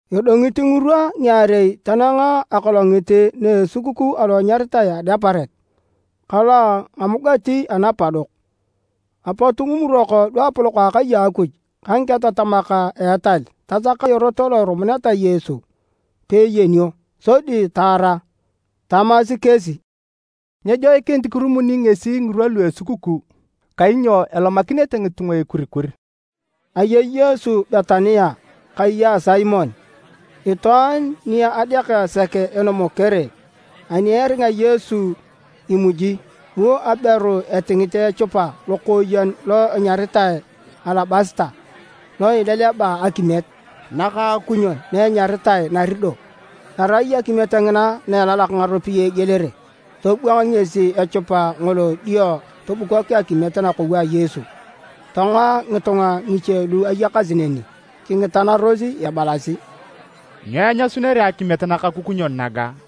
Edongit ngirwa ngiarei tanang akolongit na esukukuu alo anyaritae Adeparet ka lo a Ngamugati Anapadok. Apot ngimurok luapolok a akai a Akuj ka ngiketatamak a etal tasaka erot lo irumuneta Yesu peeyenio, sodi taara. Tamasi kesi, “Nyejoikinit kirumuni ngesi ngirwa lu a esukukuu, kainyo elomakinete ngitunga ekurikur.” Ayei Yesu Betania kai a Simon, itwaan ni adeaka sek enomokere. Ani eringa Yesu imuji, bu aberu etingit echupa lokooyen lo enyaritae alabasita lo eleleba akimiet nakaakunyon na enyaritae nardo.g Arai akimiet ngina na elalak ngaropiyae egielere. Tobwang ngesi echupa ngolo dio tobukok akimiet nakou a Yesu. Tongoa ngitunga ngiche lu ayakasi neni kingitanaros ebalasi, “Nyo enyasunere akimiet nakakukunyon naga?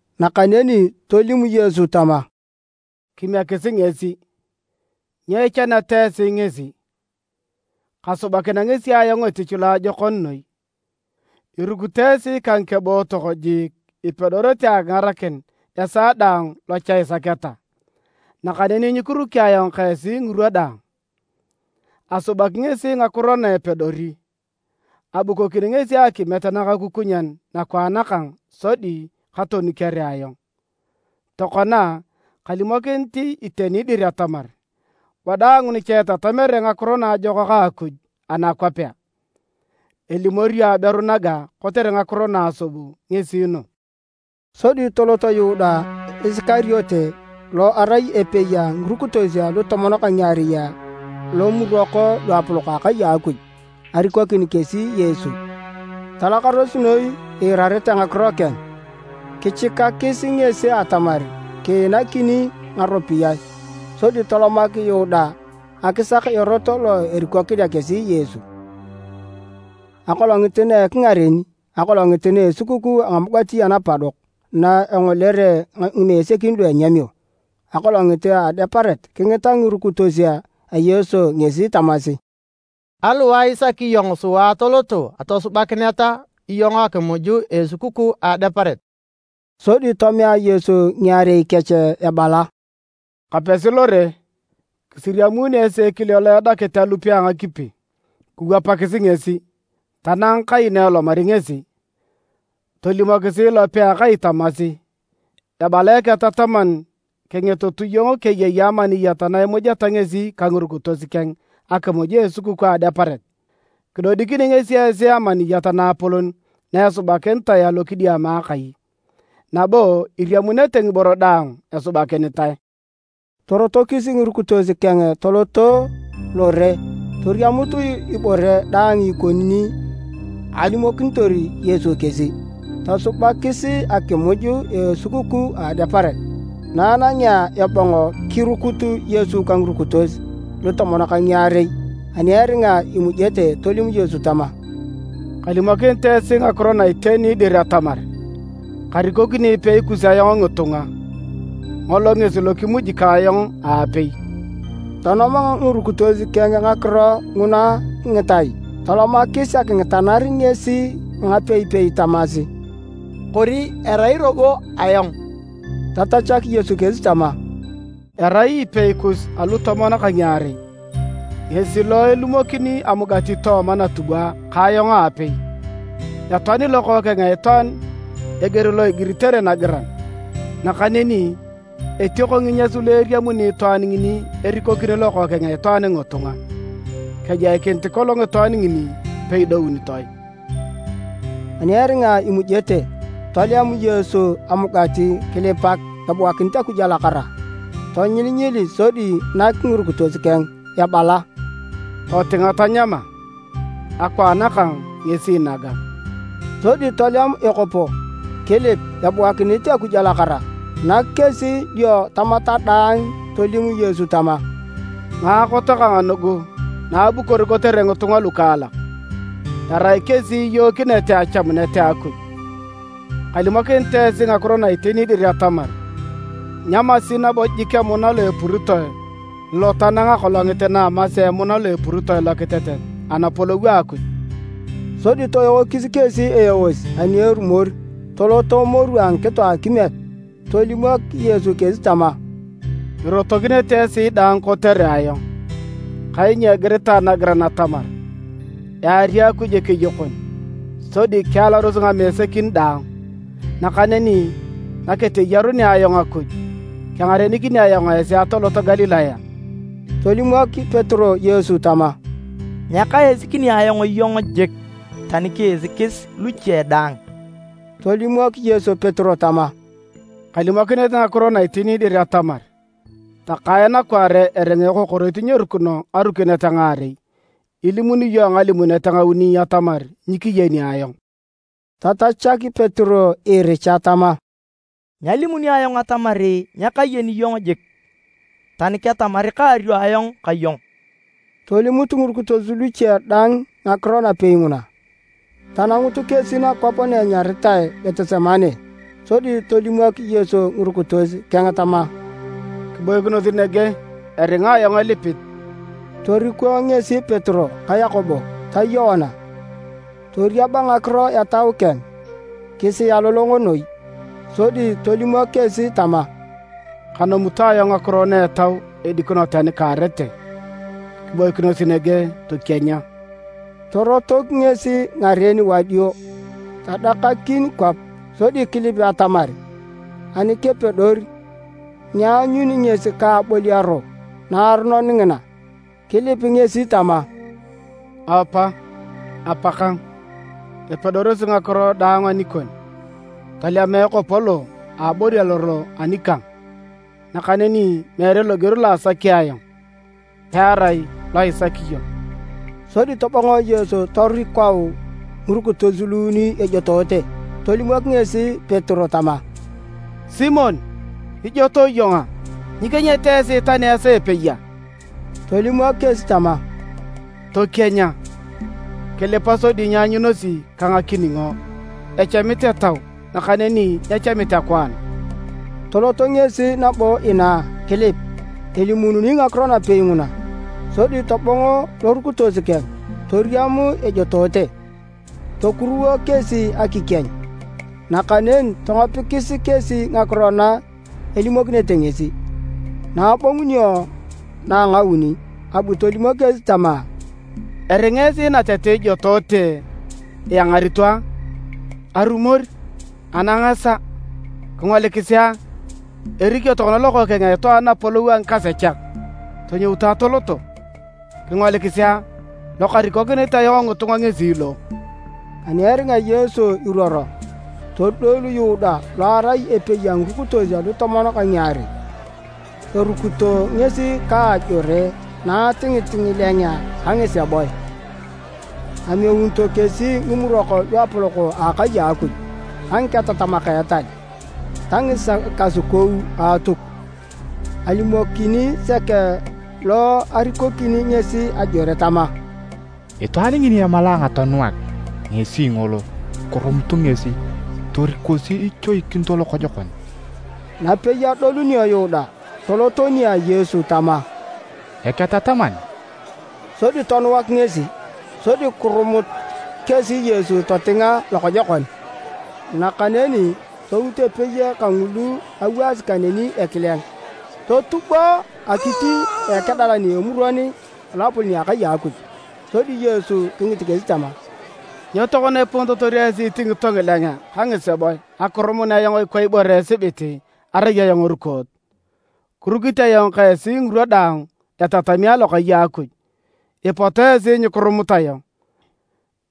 Nakaneni tolim Yesu tama, “Kimiekisi ngesi. Nyo ichaneta esi ngesi? Kasubakinea ngesi ayong etich loajokon noi. Irukito esi ka ngikebootok jiik ipedorete akingarakin esaa daang lo cha isaketa. Nakaneni nyikiruki ayong ka esi ngirwa daang. Asubaki ngesi ngakiro na epedori. Abukokini ngesi akimiet nakakukunyon nakwaan kang sodi katonukere ayong. Tokona, kalimokinit iteni dir atamar, wadaang nicha itatamere Ngakiro Naajokak a Akuj anakwapea, elimorio aberu naga kotere ngakiro na asub ngesi nugu.” Sodi tolot Yuda Isikariote lo erai epei a ngirukitos alutomon ka ngiarei, lomurok luapolok a akai a Akuj, arikokin kesi Yesu. Talakaros noi iirarete ngakiro keng, kichikakis ngesi atamar kiinakini ngaropiyae. Sodi tolomak Yuda akisak erot lo erikokinea kesi Yesu. Akolongit na ingareni akolongit na esukukuu a Ngamugati Anapadok, na engolere ngimesekin lu enyamio akolongit a Adeparet, kingita ngirukitos a Yesu ngesi tamasi, “Aliwae isaki iyong sua atoloto atosubakineta iyong akimuj a esukukuu a Adeparet?” Sodi tomea Yesu ngiarei kech ebala: “Kapesi lore, kisiriamuuni esi ekile lo edakit alupe a ngakipi. Kiwapakisi ngesi tanang kai na elomari ngesi. Tolimokis ilope a akai tamasi, ‘Ebala Eketataman kingitutu iyong keyei amaniyat na imujeta ngesi ka ngirukitos keng akimuj a esukukuu a Adeparet?’ Kidodikini ngesi esi amaniyat naapolon na esubakinitae alokidiama akai, nabo iriamunete ngiboro daang esubakinitae.” Torotokis ngirukitos keng toloto lore, toriamut ibore daang ikoni ni alimokinitor Yesu kesi. Tosubakis akimuj a esukukuu a Adeparet. Na anangea ebong, kirukut Yesu ka ngirukitos lutomon ka ngiarei. Ani eringa imujete, tolim Yesu tama, “Kalimokinit esi ngakiro na iteni dir atamar, karikokini epei kus ayong ngitunga, ngolo ngesi lo kimuji ka ayong aapei.” Tonoma ngirukitos keng ngakiro nguna ngitai tolomakis akingitanar ngesi a ngapeipei tamasi, “Kori erai robo ayong?” Tatachak Yesu kesi tama, “Erai epei kus alutomon ka ngiarei, ngesi lo ilumokini amugati tooma natubwa ka ayong aapei. Etoani Lokookeng a Itwaan eger lo igiritere nagiran, nakaneni etioko nginyas lu eriamuni itwaan ngini erikokini Lokookeng a Itwaan ngitunga! Kejoikinit kolong itwaan ngini peidounitoe!” Ani eringa imujete, tolem Yesu amugati kilipak ebuakinit Akuj alakara. Tonyilinyili sodi nak ngirukitos keng ebala, “Totinga tanyama, akwaan kang ngesi naga.” Sodi tolem ekopo, kilip ebuakinit Akuj alakara, nak kesi dio tamata daang. Tolim Yesu tama, “Ngaakot kang nugu na abukor kotere ngitunga lukaalak, erai kesi iyookinete achamunet a Akuj. Kalimokinit esi ngakiro na iteni dir atamar nyamasi nabo jik emuna lo epuritoe lo tanang akolongit na amasea emuna lo epuritoe lokitetet Anapolou a Akuj.” Sodi toeokis kesi eos ani erumor, toloto moru a ngikito a akimiet. Tolimok Yesu kesi tama, “Irotokinete esi daang kotere ayong, kainyo igiritae nagiran atamar, ‘Eari Akuj ekeyokon, sodi kialaros ngamesekin daang.’ Nakaneni naketeyarunea ayong Akuj, kengarenikini ayong esi atolot Galilaya.” Tolimok Petero Yesu tama, “Nyakaisikini ayong iyong jik, tani kiisikis luche daang!” Tolimok Yesu Petero tama, “Kalimokinit ngakiro na iteni dir atamar, takae nakwaare eringa ekokoroit nyerukino ngarukinet ngaarei, ilimuni iyong ngalimunet ngauni atamar nyikiyeni ayong.” Tatachak Petero iricha tama, “Nyalimuni ayong atamar nyakayeni iyong jik, tani ketamar kaario ayong ka iyong!” Tolimut ngirukitos luche daang ngakiro napei nguna. Tanangut kesi nakwap na anyaritae Getisemane, sodi tolimok Yesu ngirukitos keng tama, “Kiboikinos nege eringa ayong elipit.” Toriko ngesi Petero ka Yakobo ta Yoana. Toriaba ngakiro etau keng kisialolongo noi, sodi tolimok kesi tama, “Kanomito ayong ngakiro etau edikino tani kaarete. Kiboikinos nege tokienya.” Torotok ngesi ngaren wadio, tadakakin kwap sodi kilip atamar ani kepedor, nyeanyun ngesi ka aboliaro naaronon ngina. Kilip ngesi tama, “Apa, Apakang! Epedorosi ngakiro daang anikon. Tolema ekopo lo aboliaro lo anikang. Nakaneni meere loger lo asaki ayong, pearai lo isaki iyong.” Sodi tobong Yesu torukau ngirukitos luuni ejotoote. Tolimok ngesi Petero tama, “Simon, ijotoe iyong a? Nyikienyete esi tani esaa epei a?” Tolimok kesi tama, “Tokienya, kilipa sodi nyianyunosi ka akiningo. Echamit etau nakaneni nyechamit akwaan.” Tolot ngesi nabo inaa kilip elimuununi ngakiro napei nguna. Sodi tobong lorukitos keng toriam ejotoote, tokuruwo kesi akikieny. Nakaneni tongopikis kesi ngakiro na elimokinete ngesi. Na abongunio na a ngauni, abu tolimok kesi tama, “Eringa esi natete ijotoote, iangarito a? Arumor! Anang esaa! Kingolikisi a! Erikio tokona Lokookeng a Itwaan napolou a ngikasechak. Tonyoutu atoloto. Kingolikisi a, lokarikokinit ayong ngitunga ngesi lo!” Ani eringa Yesu iruoro, todolu Yuda lo erai epei a ngirukitos alutomon ka ngiarei. Arukito ngesi ka ajore naatingit ngilengea ka ngiseboe. Ameunito kesi Ngimurok Luapolok a Akai a Akuj ka ngiketatamak a etal ta ngikasukou a Atuk. Alimokini sek lo arikokini ngesi ajore tama, “Itwaan ngini emalae ayong atonuak, ngesi ngolo, kirumutu ngesi, torikosi ichoikinito lokojokon.” Napei adolunio Yuda, tolot nia Yesu tama, “Eketataman!” Sodi tonuak ngesi. Sodi kirumut kesi Yesu totinga lokojokon. Nakaneni tout epei kangulu awaasi kaneni ekileng totubo akit a akedalan a Emuron a Loapolon a akai a Akuj. Sodi Yesu kingit kesi tama, “Nyo tokona iponitotor esi itingito ngilengea ka ngiseboe akirumun ayong ikwa ibore esibit arai ayong erukoot? Kirukit ayong ka esi ngirwa daang etatami alokai a Akuj, ipot esi nyikirumut ayong.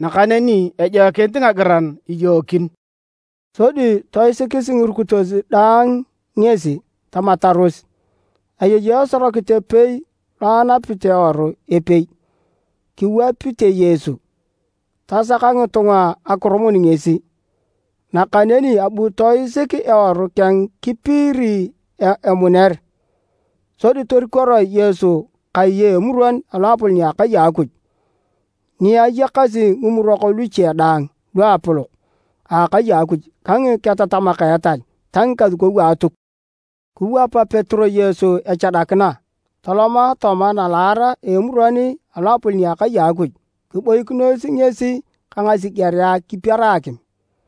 Nakaneni ejoikinit ngagiran iyookin.” Sodi toisikis ngirukitos daang ngesi, tamataros. Ayei esorokit epei lo anapit eworu epei, kiwapite Yesu. Tasaka ngitunga akirumun ngesi, nakaneni abu toisik eworu keng kipiiri emuner. Sodi torikoroe Yesu kai a Emuron a loapolon a akai a Akuj, ni ayakasi ngimurok luche daang luapolok a akai a Akuj ka ngiketatamak a etal ta ngikasukou a Atuk. Kiwap Petero Yesu echadakina toloma tooma nalaar a Emuron a Loapolon a akai a Akuj kiboikinos ngesi ka ngasigerea kipiera akim.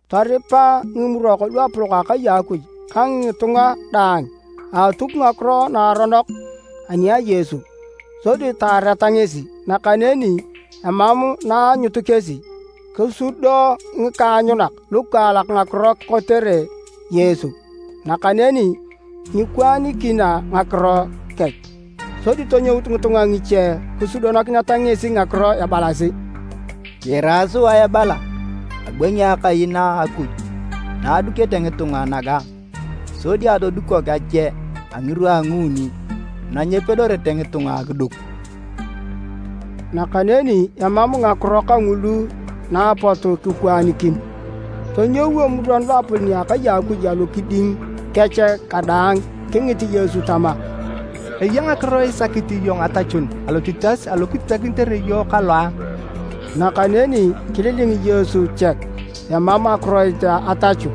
Toripa Ngimurok Luapolok a akai a Akuj ka ngitunga daang a Atuk ngakiro naaronok ani a Yesu, sodi taareta ngesi, nakaneni emam na aanyut kesi. Kisudo ngikaanyunak lukaalak ngakiro kotere Yesu, nakaneni nyikwaanikina ngakiro kech. Sodi tonyout ngitunga ngiche kisudokineta ngesi ngakiro ebalasi: “Kiira sua ebala, ‘Abwangi Akai na a Akuj na adukete ngitunga naga sodi atodukok ache a ngirwa a nguuni na nyepedorete ngitunga akiduk.’” Nakaneni emam ngakiro kangulu na apot kikwaanikin. Tonyou Emuron Loapolon a akai a Akuj alokiding kech kadaang, kingit Yesu tama, “Eya ngakiro isakit iyong atachun alotitas alo kititakinitere iyong kalo a?” Nakaneni kililing Yesu chek, emam akiroit atachu.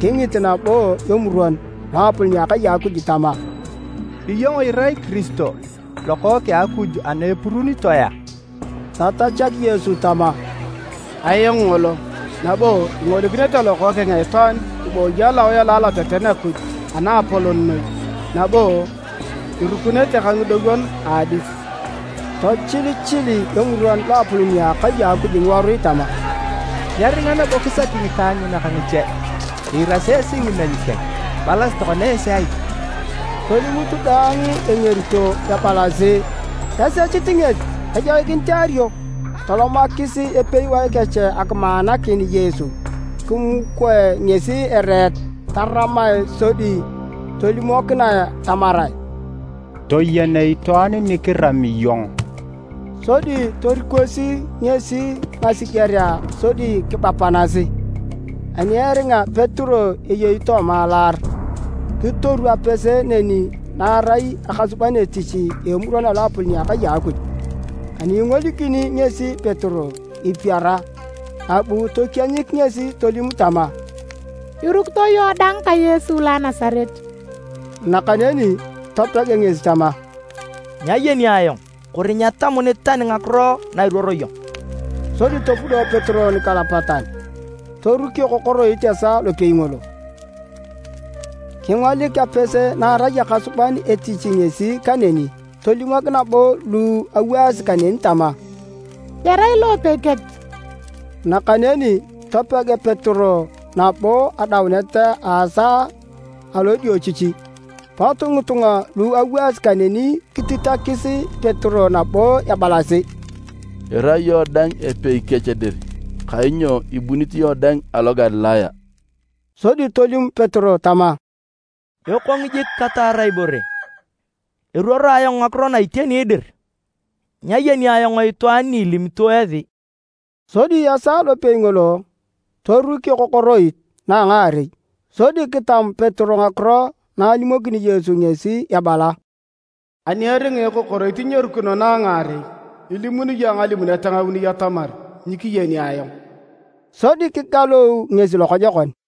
Kingit nabo Emuron Loapolon a akai a Akuj tama, “Iyong irai Kiristo, Lokookeng a Akuj ana epuruunitoe a?” Tatachak Yesu tama, “Ayong ngolo, nabo ingolikinete Lokookeng a Itwaan ibooyi alowae alo aloteten a Akuj Anaapolon noi nabo irukunete ka ngidowon a adis!” Tochilichili Emuron Loapolon a akai a Akuj ngiworui tama, “Nyeringa nabo kisaki ngikaanyunak ngiche! Iirasi esi ngimeny keng. Ibalasi tokona esi ai?” Tolimut daang engerito ebalasi: esechit ngesi ejoikinit eario. Tolomakis epewae kech akimaanakin Yesu, kimukoe ngesi ereet taramae, sodi tolimokinae tamarae, “Toyen itwaan ni kirami iyong!” Sodi torikosi ngesi ngasigerea sodi kibapanasi. Ani eringa Petero eyei tooma nalaar, kitoru apese neni naarai akasuban etich a Emuron a Loapolon a akai a Akuj. Ani ingolikini ngesi Petero ipiara, abu tokienyik ngesi tolim tama, “Irukito iyong dang ka Yesu lo a Nasaret.” Nakaneni topeg ngesi tama, “Nyayeni ayong... kori nyetamunit tani ngakiro na iruoro iyong.” Sodi topudo Petero nikalapatan. Toruk ekokoroit esaa lopei ngolo. Kingolik apese na arai akasuban etich ngesi kaneni tolimok nabo lu awaasi kaneni tama, “Erai lo epei kech!” Nakaneni topeg Petero nabo. Adaunet a esaa alodiochichi, pot ngitunga lu awaasi kaneni kititakis Petero nabo ebalasi, “Irai iyong dang epei kech dir, kainyo ibunit iyong dang alo Galilaya.” Sodi tolim Petero tama, “Ekong jik kataar ibore, eruoro ayong ngakiro na iteni dir! Nyayeni ayong itwaan ni ilimito esi!” Sodi esaa lopei ngolo, toruk ekokoroit na a ngaarei. Sodi kitam Petero ngakiro na alimokini Yesu ngesi ebala, “Ani eringa ekokoroit nyerukino na a ngaarei, ilimuni iyong ngalimunet ngauni atamar nyikiyeni ayong.” Sodi kikalou ngesi lokojokon.